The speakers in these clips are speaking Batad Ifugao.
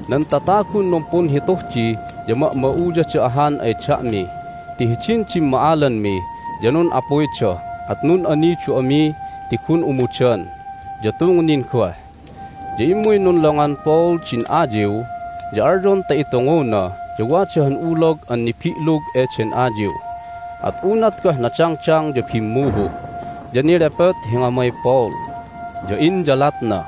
Nan tatagun numpunhituh di ya ma'ma'uyada ahan ay da'mi ti hidin dimma'alanmi ya nun'apuyda, at nun'anidu ami ti gun umudan, ya tungnin goh. Ya immuy nunlongan Paul din ayiw, ya alyon ta itunguna, ya wada han ulog an nibi'lug eden ayiw. At unat goh nadangdang ya bimmuhu', ya nelepot hi ngamay Paul, ya inyalatna.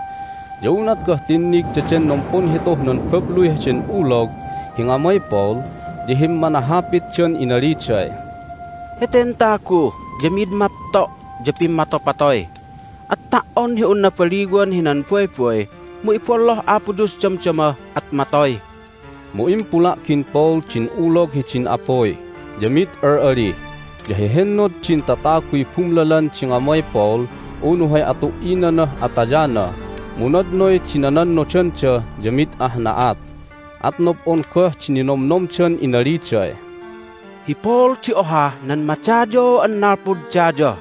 Ya unat goh tinnig daden numpunhituh nan babluy heden ulog hi ngamay Paul ya himmanahapitdan inaliday, "Heten tagu ya mid mapto' ya pimmatopatoy, at ta"on hi un nabaliwan hinan baybay mu ibolloh Apo Dios damdama, at matoy!" Mu impula'gin Paul din ulog hidin apuy, ya mid al'ali. Ya hehennod din tataguy bumlalan din ngamay Paul unu hay atu"inanah atayana, mu nadnoy di nanannodanda ya mid ah na'at. At nob'on goh di ninomnomdan inaliday, "Hi Paul di ohah nan madayaw an nalpud daya!"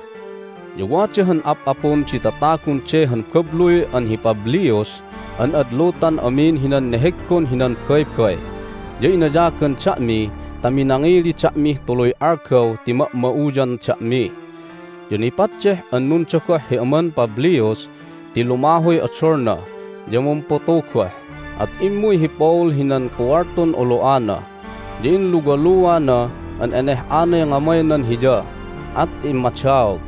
Ya wada han ap'apun di tatagun de han babluy an hi Publius an ad lutan amin hinan neheggon hinan baybay, ya inayagan da'mi ta minangili da'mih tuluy algaw ti ma'ma'uyan da'mi. Ya nipaddeh an nundogoh hi aman Publius ti lumahuy odolna, ya mumputu goh. At immuy hi Paul hinan kuwaltun olo'ana, ya inluwaluana an eneh'anay ngamaynan hiya, at immadaog.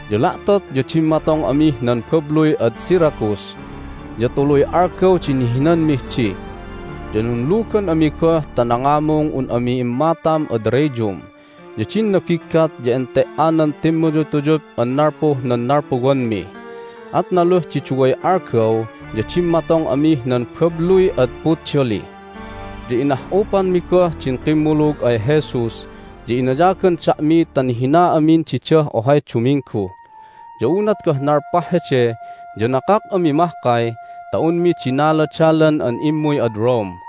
Ya la'tot ya dimmatong amih nan babluy ad Syracuse, ya tuluy algaw di nihinanmih di. Ya nunlugan ami goh ta nangamung un ami immatam ad Rhegium. Ya din nabiggat ya ente"anan timmuyutuyup an nalpuh nan nalpuwanmi, at naluh di duway algaw ya dimmatong amih nan babluy ad Puteoli. Ya inah'upanmi goh din kimmulug ay Jesus, ya inayagan da'mi ta nihina amin didah ohay duminggu. Ya unat goh nalpah hede ya nakak ami mahkay ta unmi dinaladalan an immuy ad Rome.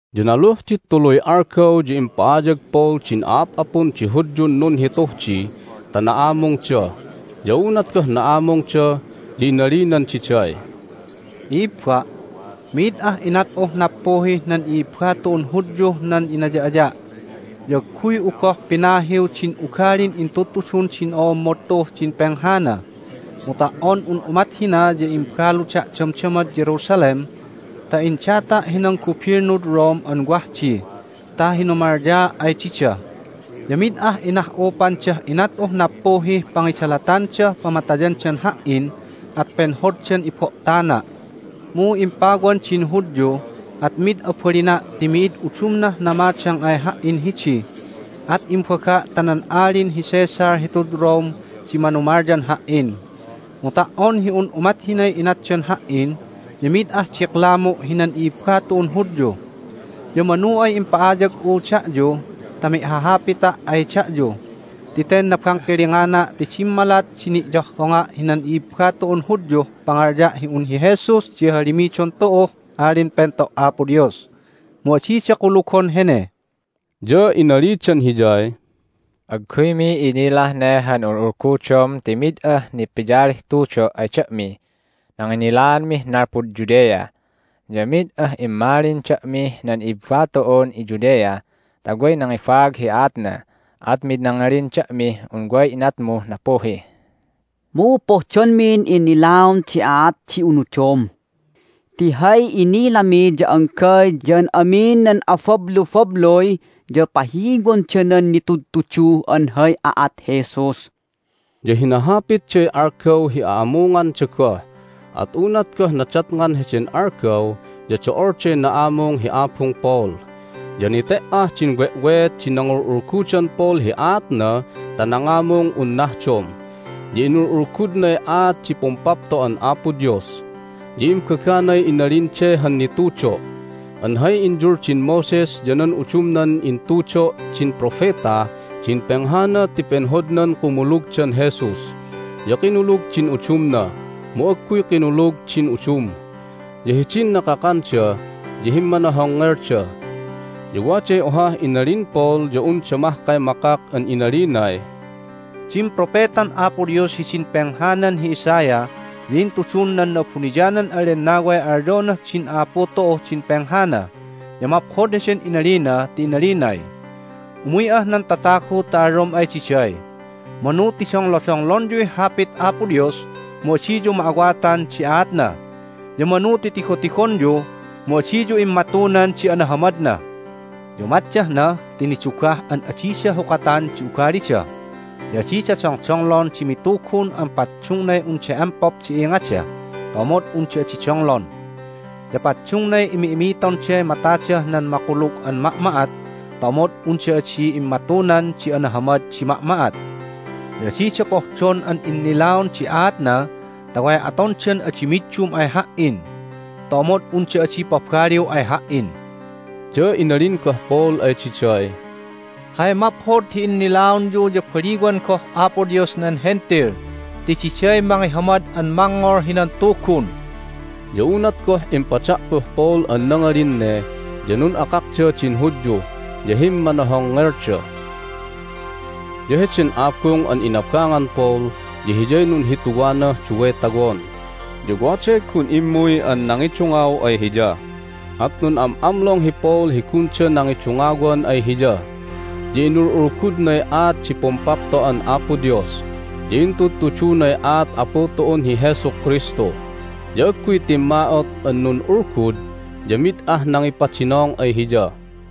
Ya naluh di tuluy algaw ya impa'ayag Paul din a'ap'apun di Hudyun nunhituh di ta na'amungda. Ya unat goh na'amungda ya inalinan diday, "I'ibba', mi'id ah inat'uh nappuhih nan i'ibba tu'un Hudyuh nan inaya'aya', ya agguy'u goh pinahiw din ugalin intudtudun din o'ommod tu'uh din penghana. Mu ta"on un umat hina ya imbaluda' damdamad Jerusalem ta indata' hinan gubilnud Rome an wah di ta hinumalyaa' ay dida. Ya mid ah inah'upandah inat'uh nappuhih pangidalatandah pamatayandan ha"in, at penhoddan ibo'tana'. Mu impawan din Hudyu, at mid abalina' ti mi'id udumnah namadang ay ha"in hidi, at imbaga' ta nan Alin hi Caesar hitud Rome di manumalyan ha"in. Mu ta"on hi un umat hinay inatdan ha"in ya mi'id ah diklamu' hinan i'ibba tu'un Hudyu. Ya manu ay impa'ayag'u da'yu ta mi'hahapita' ay da'yu, ti ten nabangkilingana' ti dimmalat di ni'yohhonga' hinan i'ibba tu'un Hudyuh pangalya' hi un hi Jesus di hahalimidon tu'uh Alin Pento' Apo Dios, mu adida kulugon hene." Ya inalidan hiyay, "Agguymi inilah ne han ul'ulgudom ti mid ah nipiyalih tudo' ay da'mih nanginnilaanmih nalpud Judea, ya mid ah immalin da'mih nan i'ibba tu'un iJudea ta way nangibaag hi aatna. At mid nangalin da'mih un way inatmuh nappuhi. Mu pohdonmin innilaon di aat di unudom. Ti hay inilami ya anggay ya an amin nan abablubabluy ya pahiwonda nan nitudtudu an hay aat Jesus." Ya hinahapitday algaw hi a'amunganda goh. At unat goh nadatngan heden algaw ya do'olday na'amung hi abung Paul, ya nete"ah din we'weet di nangul'ulgudan Paul hi aatna ta nangamung un nahdom, ya inul'ulgudnay aat di Pumpapto'an Apo Dios. Ya imbaganay inalin de han nitudo' an hay inyuldin Moses ya nan udumnan intudo' din propetah din penghana ti penhodnan kumulugdan Jesus. Ya kinulug din udumna, mu agguy kinulug din udum. Ya hidin nakakanda ya himmanohongngelda. Ya waday ohah inalin Paul ya unda mahkay makak an inalinay, "Din propetan Apo Dios hidin penghanan hi Isaiah ya intudun nan Na'abuniyanan an Lennaway alyonah din a'apu tu'uh din penghana, ya maphod heden inalina ti inalinay, Umuy'ah nan tatagu ta alyom ay diday, Manu ti donglodonglonyuy Hapit Apo Dios, mu adiyu ma'awatan di aatna, ya manu ti tigotigonyu, mu adiyu immatunan di anahamadna. Ya umatdah na ti nidugah an adida hukatan di ugalida, ya adida dongdonglon di mitugun an paddungnay unda empop di ingada ta omod unda adi donglon. Ya paddungnay imi'imitonday matadah nan makulug an ma'ma'at ta omod unda adi immatunan di anahamad di ma'ma'at. Ya adida pohdon an innilaon di aatna ta way atondan adi middum ay Ha"in ta omod unda adi pabaliw ay Ha"in." Ya inalin goh Paul ay diday, "Hay maphod hi innilaonyu ya baliwan goh Apo Dios nan Hentil ti diday mangihamad an mangngol hinan Tugun!" Ya unat goh impada'puh Paul an nangalin ne ya nun'akakda din Hudyu, ya himmanohongngelda. Ya heden abung an inabangan Paul ya hiyay nunhituwanah duway tawon. Ya waday gun immuy an nangidungaw ay hiya, at nun'am'amlong hi Paul hi gunda nangidungawan ay hiya. Ya inul'ulgudnay aat di Pumpapto'an Apo Dios, ya intudtudunay aat Apu tu'un hi Jesu Kristu, ya agguy timma'ot an nun'ulgud, ya mid ah nangipadinong ay hiya.